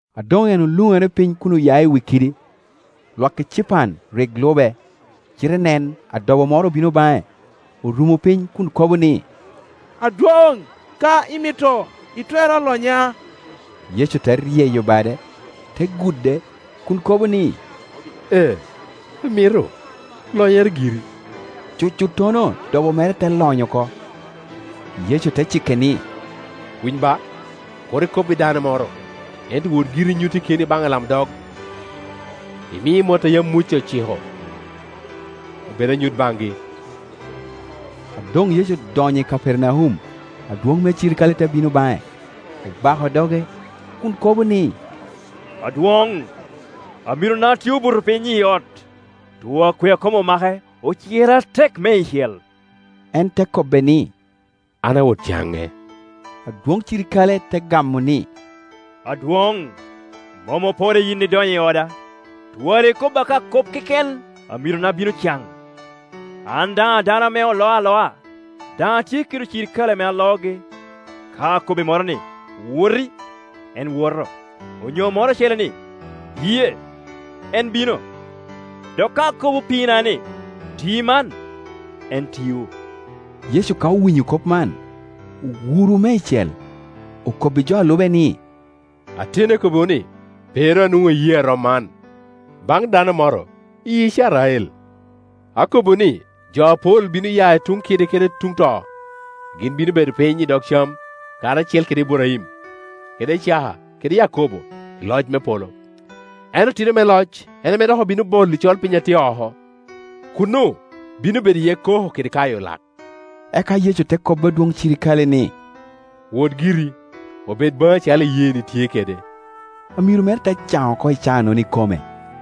A doŋ en oluŋere piny kun oya i wi kidi, lwak ecipan rik lube, cite nen adobo moro obino baŋe, orumo piny kun kobo ni, “Adwoŋ, ka imito, itwero lonya.” Yecu te ryeyo bade, te gude, kun kobo ni, “Ee, amito, lonyere giri.” Cucuttono dobo mere te lony oko. Yecu te cike ni, “Winy ba, kur ikob i dano moro, ento wot giri, inyutte keni baŋ alamdog, imi mot a yam Muca ociko, obed anyut bangi.” A doŋ Yecu odonyo i Kapernaum, adwoŋ me cirikale te bino baŋe, obako doge kun kobo ni, “Adwoŋ, amirona tye obuto piny i ot, too akwea kom omake, ocire atek meicel.” En te kobbe ni, “An awot caŋe.” Adwoŋ cirikale te gamo ni, “Adwoŋ, mom oporre yin idonyo i oda; twara ikobo ka kop keken, amirona bino can. An daŋ a dano ame oloo aloa, daŋ atye kede cirikale ame aloogi. Ka akobbi moro ni, ‘Woti’, en woto; onyo moro ocele ni, ‘Biye’, en bino; dok ka akobo opiina ni, ‘Ti man’, en tio.” Yecu ka owinyo kop man, owuro meicel, okobbi jo a lube ni, “Ateni akobbiwu ni, pe ru anwoŋo iyee a rom man, baŋ dano moro i Icrael. Akobbiwu ni jo apol bino ya i tuŋ kide kede tuŋ to, gin bino bedo piny i dog cam karacel kede Iburaim, kede Icaka, kede Yakobo i loc me polo, ento otino me loc en ame dok obino bolo i colpiny a tye oko; kuno bino bedo iye koko kede kayo lak.” Eka Yecu te kobbi adwoŋ cirikale ni, “Wot giri, obed baŋi acalo iyeeni tye kede.” Amiro mere te caŋ oko i caanono ikome.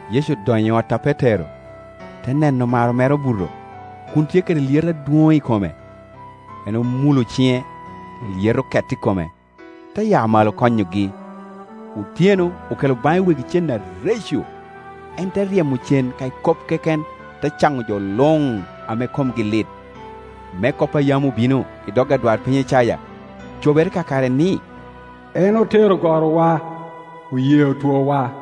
Yecu odonyo i ot a Petero, te neno maro mere obuto, kun tye kede lyeto adwoŋ i kome. En omulo ciŋe, lyeto oket i kome, te ya malo, konyogi. Otyeno okelo baŋe wegi cen areco; en te ryemo cen ka i kop keken, te caŋo jo luŋ ame komgi lit, me kop a yam obino i dog adwarpiny Icaya cobere kakare, ni, “En otero gorowa, oyeo toowa.”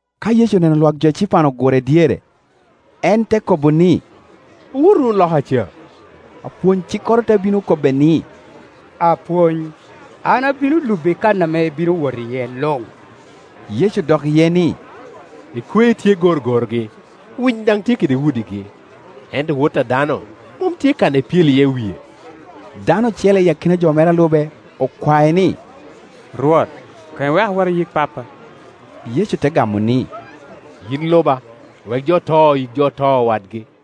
Ka Yecu oneno lwak jo ecipan ogure dyere, en te kobo ni, “Owot wunu loka ca.” Apwony-cikkoro te bino kobbe ni, “Apwony, an abino lubi i kan ame ibino wot iye luŋ.” Yecu odok iye ni, “Ekwe tye kede gorogorogi, winy daŋ tye kede udigi, ento wot a dano mom tye kan ame epyelo iye wie.” Dano ocele i akina jo mere alube okwae ni, “Rwot, koŋ iweka awot ayik pappa.” Yecu te gamo ni, “Yin luba, wek jo oto yik jo oto wadgi.”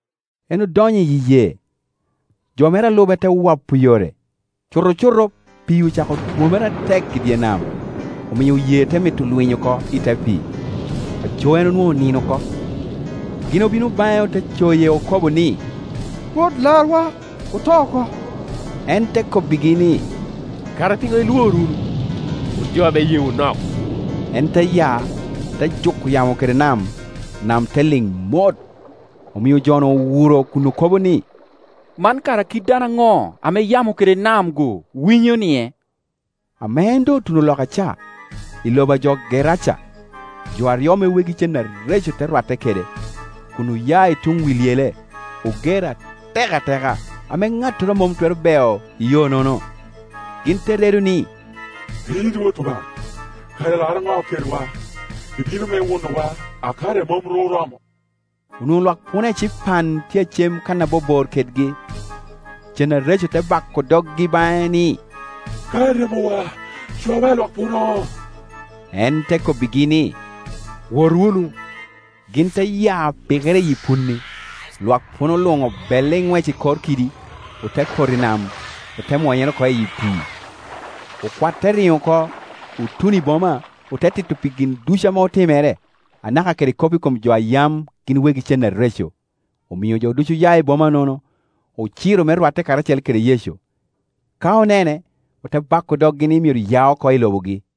En odonyo i yee, jo mere a lube te wopo yore. Cutocuto pii ocako twomere atek i dye nam, omio yee te mito lwiny oko i te pii; aco en onwoŋo onino oko. Gin obino baŋe ote coye okobo ni, “Rwot, larwa; oto oko!” En te kobbigi ni, “Kara piŋo ilwor wunu, wun jo ame iyeewu nok?” En te ya, te juko yamo kede nam, nam te liŋ mot. Omio jo-nu owuro kun okobo ni, “Man kara kit dano aŋo ame yamo kede nam-gu winyonie?” Ame en doŋ otuno loka ca, i lobo a jo Geraca, jo aryo ame wegi cen areco te rwatte kede, kun oya i tuŋ wi lyele, oger atek ateka, ame ŋattoro mom twero beo i yo nono. Gin te redo ni, “Yin Wot Obaŋa, kara ilaro ŋo kedwa? Ibino me wunowa a kare mom ru oromo?” Onwoŋo lwak puno ecipan tye a cem kan a bobor kedgi. Cen areco te bako doggi baŋe ni, “Ka iryemowa, cwawa i lwak puno.” En te kobbigi ni, “Wot wunu.” Gin te ya pikere iyi punni; lwak puno luŋ obelle i nwec i kor kidi, ote poto i nam, ote mwonyere oko i pii. Okwat te riŋo oko, otuno i boma, ote tito pi gin ducu ame otimere, anaka kede kop i kom jo a yam gin wegi cen areco. Omio jo ducu oya i boma-nono, ociro me rwatte kede Yecu; ka onene, ote bako doggi ni myero ya oko i lobogi.